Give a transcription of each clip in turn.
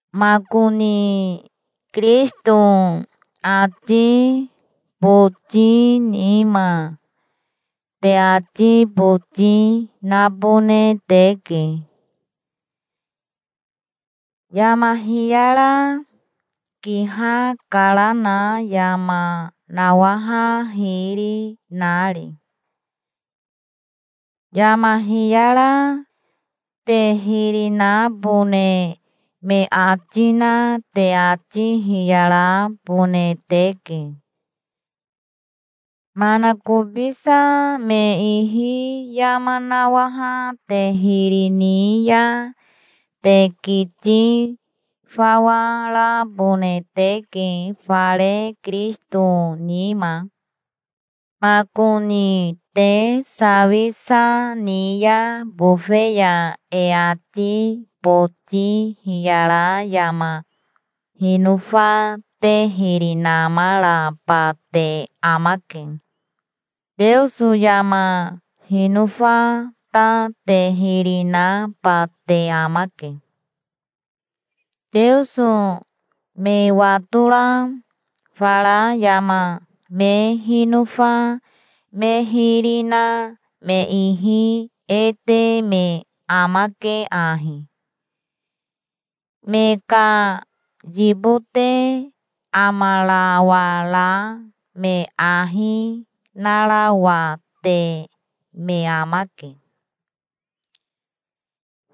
Makoni Kirisito ati boti nima te ati boti nabone teke, yama hiyara kihakarana yama nawaha hiri nari. Yama hiyara te hiri nabone me ati na te ati hiyarabone teke. Manakobisa me ihi yama nawaha te hiri ni ya te kiti fawa rabone teke fare Kirisito nima. Makoni te sawisa ni ya bofe ya e ati boti hiyara yama hinofa te hiri namaraba te amake. Teoso yama hinofa ta te hiri naba te amake. Teoso me watora fara yama me hinofa me hiri na me ihi e te me amake ahi: me ka yibote amarawara me ahi narawate me amake.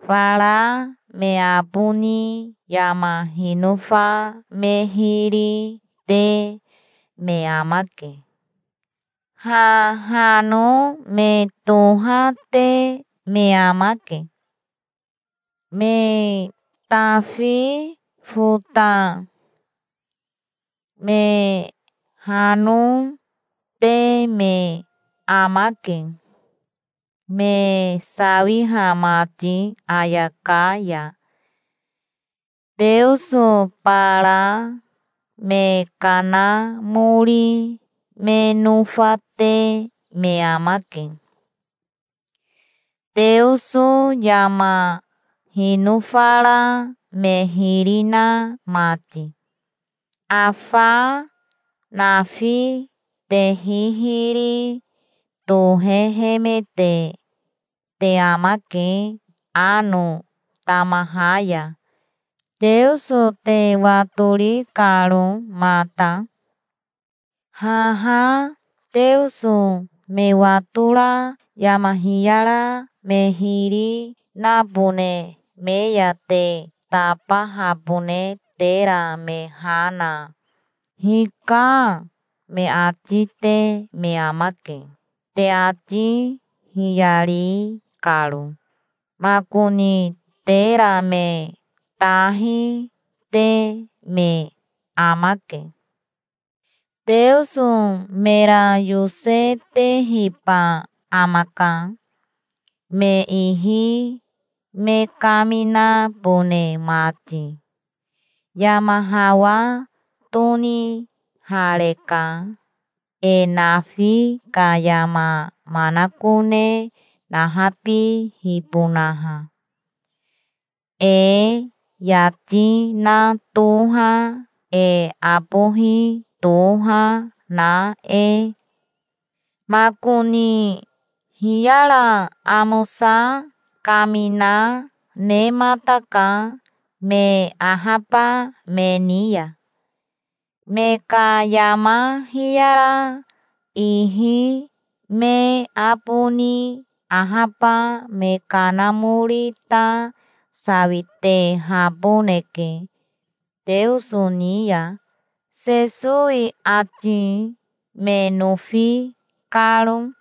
Fara me aboni yama hinofa me hiri te me amake. Hahano me tohate me amake. Me tafi fota, me hano, te me amake, me sawiha mati ayaka ya. Teoso bara me kanamori me nofate me amake, Teoso yama hinofara me hiri na mati. Afa nafi te hihiri tohehemete te amake ano tamaha ya, Teoso te watori karo mata. Haha Teoso me watora yama hiyara me hiri nabone me ya te tabahabone tera me ha na, "Hika", me ati te me amake, te ati hiyari karo. Makoni tera me tahi te me amake. Teoso mera yosetehiba amaka, me ihi me kaminabone mati. Yama hawa tonihareka, e nafi ka yama manakone nahabihibonaha, e yati na toha, e abohi toha na e. Makoni hiyara amosa kamina nemataka me ahaba me ni ya. Me ka yama hiyara ihi me aboni ahaba me kanamori ta sawitehaboneke Teoso ni ya, Sesowi ati me nofi karo.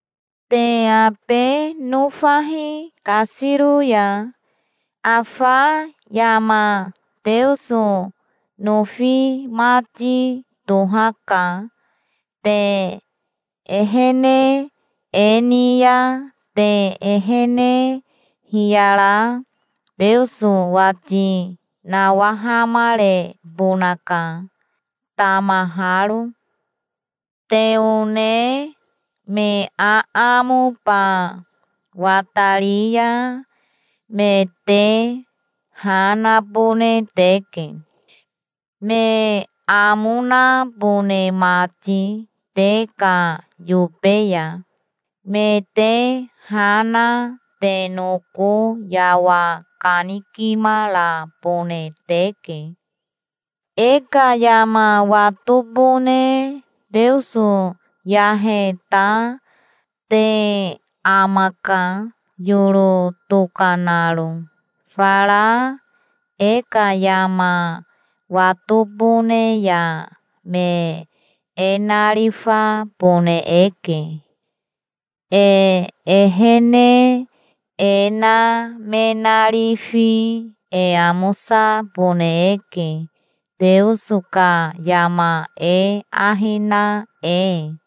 Te abe nofahi kasiro ya. Afa yama Teoso nofi mati tohaka. Te ehene e ni ya te ehene hiyara Teoso wati nawahamarebonaka, tamaharo. Te one me aamoba watari ya me te ha nabone teke, me amo nabone mati te ka yobe ya. Me te ha na te noko yawa kanikimarabone teke. E ka yama watobone Teoso yahe ta te amaka, yoro tokanaro. Fara e ka yama watobone ya me e narifabone eke. E ehene e na me narifi e amosabone eke, Teoso ka yama e ahi na e.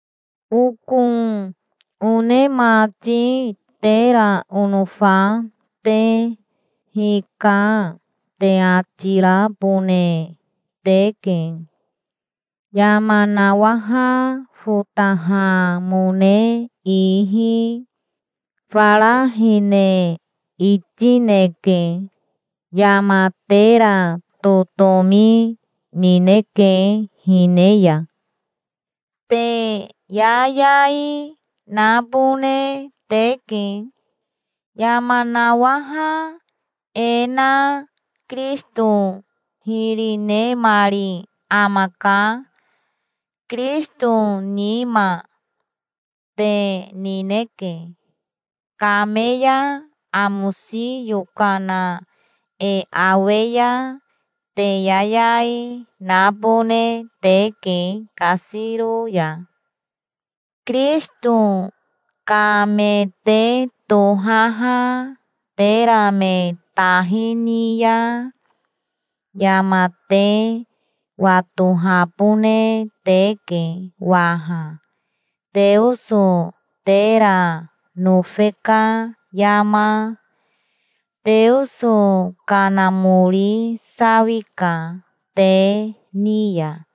Oko one mati, tera onofa te, "Hika", te ati rabone teke, yama nawaha fotahamone ihi. Fara hine itineke. Yama tera totomi nineke hine ya. Te yayai nabone teke. Yama nawaha e na Kirisito hiri nemari amaka. Kirisito nima te nineke. Kame ya amosi yokana e awe ya te yayai, nabone teke kasiro ya. Kirisito ka me te tohaha tera me tahi ni ya, yama te watohabone teke waha, Teoso tera nofe ka yama. Teoso Kanamori sawika te ni ya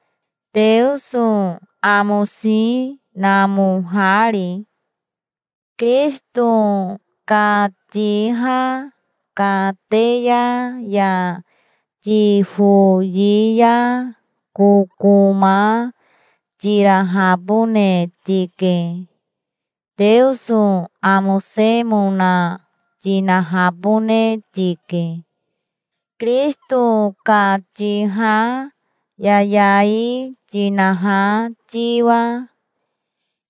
Teoso amosi namohari. Kirisito ka tiha kateya ya tifoyi ya kokoma tirahabone tike. Teoso amosemona tinahabone tike, Kirisito ka tiha yayai tinaha tiwa.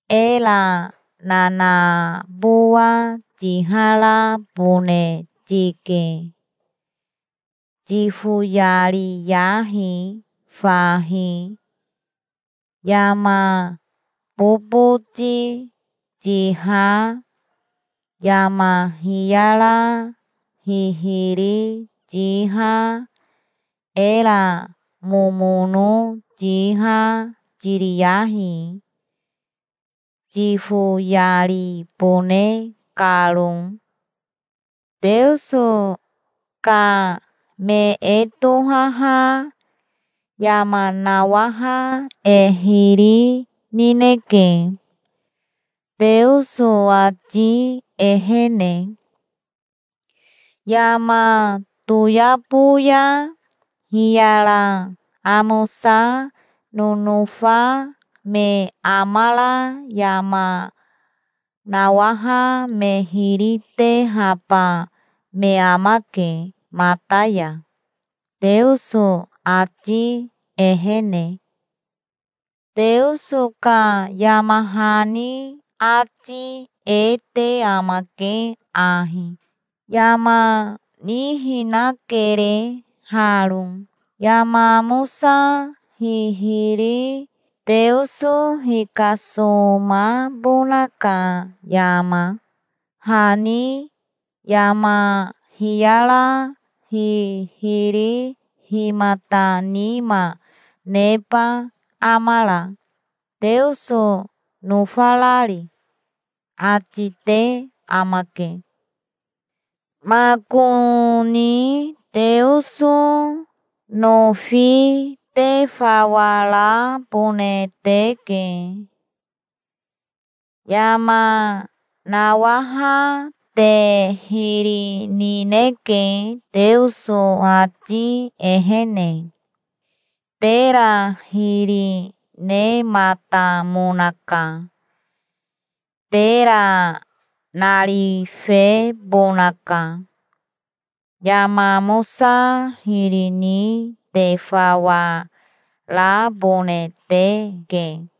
Era nanabowa tiharabone tike. Tifoyariyahi fahi. Yama boboti tiha, yama hiyara hihiri tiha, era momono tiha tiriyahi, tifoyaribone karo. Teoso ka me e tohaha yama nawaha e hiri nineke, Teoso ati ehene. Yama toyabo ya hiyara amosa nonofa me amara yama nawaha me hiri tehaba me amake mata ya, Teoso ati ehene. Teoso ka yama hani ati e te amake ahi: "Yama nihinakere haro, yama amosa hihiri Teoso hikasomabona ka yama. Hahi yama hiyara hihiri himata nima neba amara, Teoso nofarari?" ati te amake. Makoni Teoso nofi te fawa rabone teke. Yama nawaha te hiri nineke Teoso ati ehene. Tera hiri nematamonaka. Tera narifebonaka. Yama amosa hiri ni te fawa rabone teke.